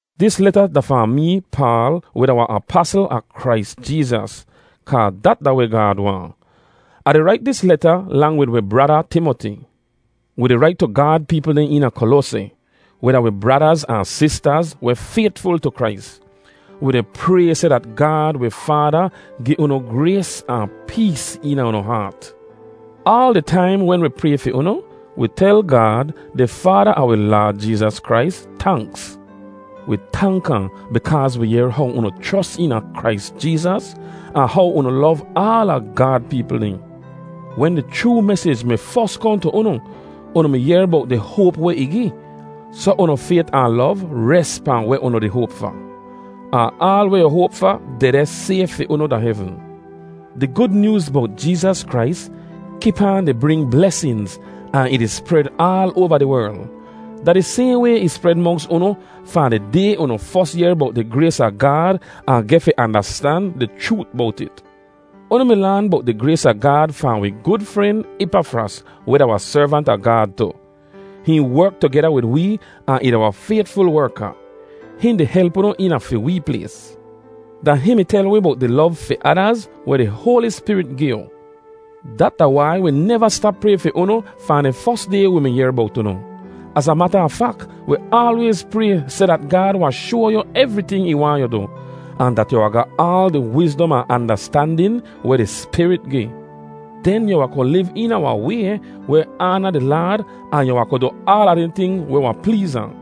Dis leta da fahn mee, Paal, weh da wahn apasl a Krais Jeezas, kaa dat da weh Gaad waahn. Ah di rait dis leta lang wid wi brada Timoti. Wi di rait tu Gaad peepl dehn eena Koloaseh, weh da wi bradaz ahn sistaz weh faytful tu Krais. Wi di pray seh dat Gaad wi Faada gi unu grays ahn pees eena unu haat. Aal di taim wen wi pray fi unu, wi tel Gaad, di Faada a wi Laad Jeezas Krais, tanks. Wi tank ahn bikaaz wi yehr how unu chros eena Krais Jeezas ahn how unu lov aala Gaad peepl dehn. Wen di chroo mesij mi fos kohn tu unu, unu mi yehr bowt di hoap weh ih gi. Soh unu fayt ahn lov res pahn weh unu di hoap fa; ahn aal weh yu hoap fa dehdeh sayf fi unu da hevn. Di Gud Nyooz bowt Jeezas Krais kip aan di bring blesinz ahn ih di spred aal oava di werl. Da di sayhn way ih spred monks unu fahn di day unu fos yehr bowt di grays a Gaad ahn geh fi andastan di chroot bowt it. Unu mi laan bowt di grays a Gaad fahn wi gud fren, Ipafras, weh da wahn servant a Gaad tu. Hihn werk tugeda wid wee ahn ih da wahn faytful werka. Hihn di help unu eena fi wee plays. Da hihn mi tel wi bowt di lov fi adaz weh di Hoali Spirit gi yu. Dat da wai wi neva stap pray fi unu fahn di fos day wi mi yehr bowt unu. Az a mata a fak, wi aalwayz pray seh dat Gaad wahn shoa yu evriting ih waahn yu du, ahn dat yu wahn ga aal di wizdom ahn andastandin weh di Spirit gi. Den yu wahn ku liv eena wahn way weh aana di Laad ahn yu wahn ku du aala dehn ting weh wahn pleez ahn.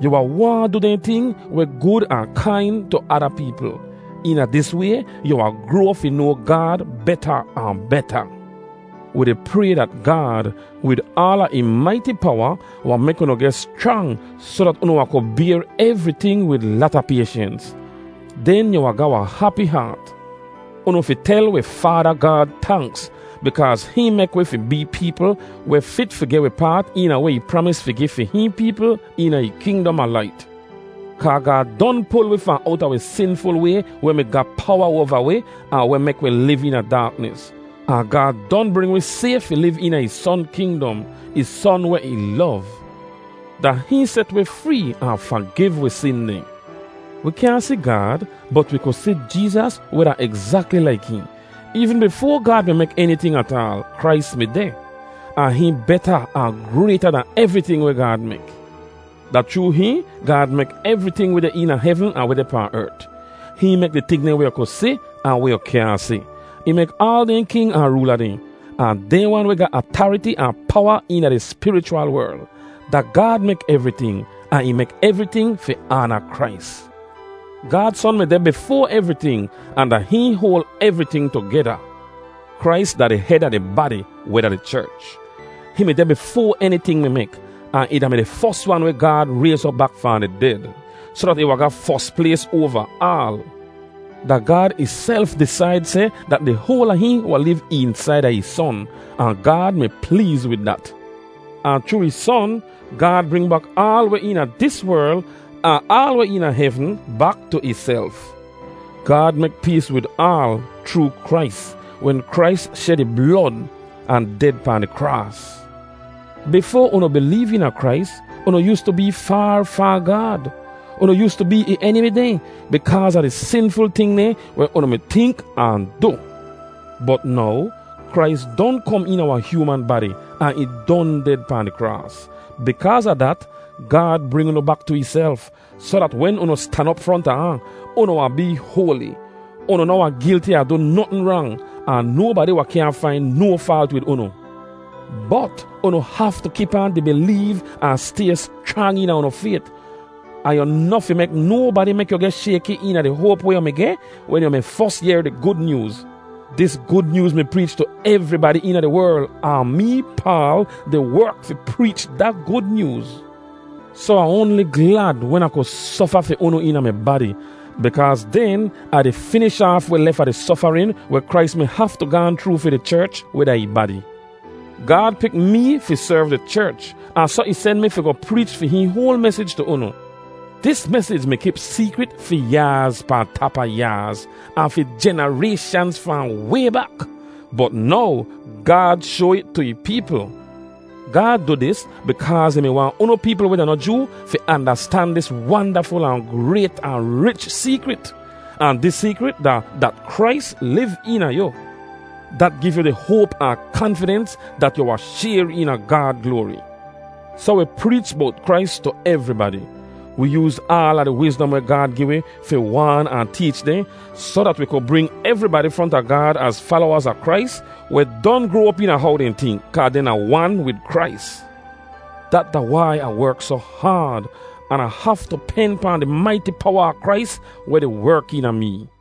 Yu wahn waahn du dehn ting weh gud ahn kain tu ada peepl. Eena dis way yu wahn groa fi noa Gaad beta ahn beta. Wi di pray dat Gaad, wid aala ih maiti powa, wahn mek unu geh schrang soh dat unu wahn ku bayr evriting wid lata payshens, den yu wahn ga wahn hapi haat. Unu fi tel wi Faada Gaad tanks, bikaaz hihn mek wi fi bee peepl weh fit fi geh wi paat eena weh ih pramis fi gi fi hihn peepl eena ih kingdom a lait. Kaa Gaad don pul wi fahn owta wi sinful way weh mi ga powa oava wi ahn weh mek wi liv eena daaknis. Ahn Gaad don bring wi sayf fi liv eena ih Son kingdom, ih Son weh ih lov. Da hihn set wi free ahn fagiv wi sin dehn. Wi kyaahn si Gaad bot wi kud si Jeezas weh da egzakli laik hihn. Eevn bifoa Gaad mi mek eniting ataal, Krais mi deh. Ahn hihn beta ahn grayta dan evriting weh Gaad mek. Da chroo hihn, Gaad mek evriting weh deh eena hevn ahn weh deh pahn ert; hihn mek di ting dehn weh yu ku si ahn weh yu kyaahn si. Ih mek aal dehn king ahn roola dehn, ahn dehn wan weh ga atariti ahn powa eena di spirichwal werl. Da Gaad mek evriting, ahn ih mek evriting fi aana Krais. Gaad Son mi deh bifoa evriting ahn da hihn hoal evriting tugeda. Krais da di hed a di badi, weh da di cherch. Hihn mi deh bifoa eniting mi mek, ahn ih da-mi di fos wan weh Gaad rayz op bak fahn di ded, soh dat ih wahn ga fos plays oava aal. Da Gaad ihself disaid seh dat di hoal a hihn wahn liv eensaida ih Son, ahn Gaad mi pleez wid dat. Ahn chroo ih Son, Gaad bring bak aal weh eena dis werl ahn aal weh eena hevn bak tu ihself. Gaad mek pees wid aal chroo Krais wen Krais shed ih blod ahn ded pahn di kraas. Bifoa unu bileev eena Krais, unu yoostu bee faar fahn Gaad. Unu yoostu bee ih enimi dehn bikaaz a di sinful ting dehn weh unu mi tink ahn du. Bot now Krais don kom eena wahn hyooman badi ahn ih don ded pahn di kraas. Bikaaz a dat, Gaad bring unu bak tu ihself, soh dat wen unu stan op fronta ahn, unu wahn bee hoali. Unu noh wahn gilti a du notn rang, ahn nobadi wahn kyaahn fain no faalt wid unu. Bot unu haftu kip aan di bileev ahn stay schrang eena unu fayt ahn yu noh fi mek nobadi mek yu geh shayki eena di hoap weh yu mi geh wen yu mi fos yehr di Gud Nyooz. Dis Gud Nyooz mi preech tu evribadi eena di werl, ahn mee, Paal, di werk fi preech da Gud Nyooz. Soh Ah oanli glad wen Ah ku sofa fi unu eena mi badi, bikaaz den Ah di finish aaf weh lef a di sofarin weh Krais mi haftu gaahn chroo fi di cherch weh da ih badi. Gaad pik mee fi serv di cherch ahn soh ih sen mi fi goh preech fi hihn hoal mesij tu unu. Dis mesij mi kip seekrit fi yaaz pahn tap a yaaz, ahn fi jenarayshanz fahn way bak, bot now Gaad shoa it tu ih peepl. Gaad du dis bikaaz ih mi waahn unu peepl weh da noh Joo fi andastan dis wandaful ahn grayt ahn rich seekrit. Ahn dis seekrit da dat Krais liv eena yu. Dat giv yu di hoap ahn kanfidens dat yu wahn shayr eena Gaad gloari! Soh wi preech bowt Krais tu evribadi. Wi yooz aala di wizdom weh Gaad gi wi fi waan ahn teech dehn soh dat wi ku bring evribadi fronta Gaad az falowaz a Krais weh don groa op eena how dehn tink kaa dehn da wan wid Krais. Dat da wai Ah werk soh haad an Ah haftu pen pahn di maiti powa a Krais weh di werk eena mee.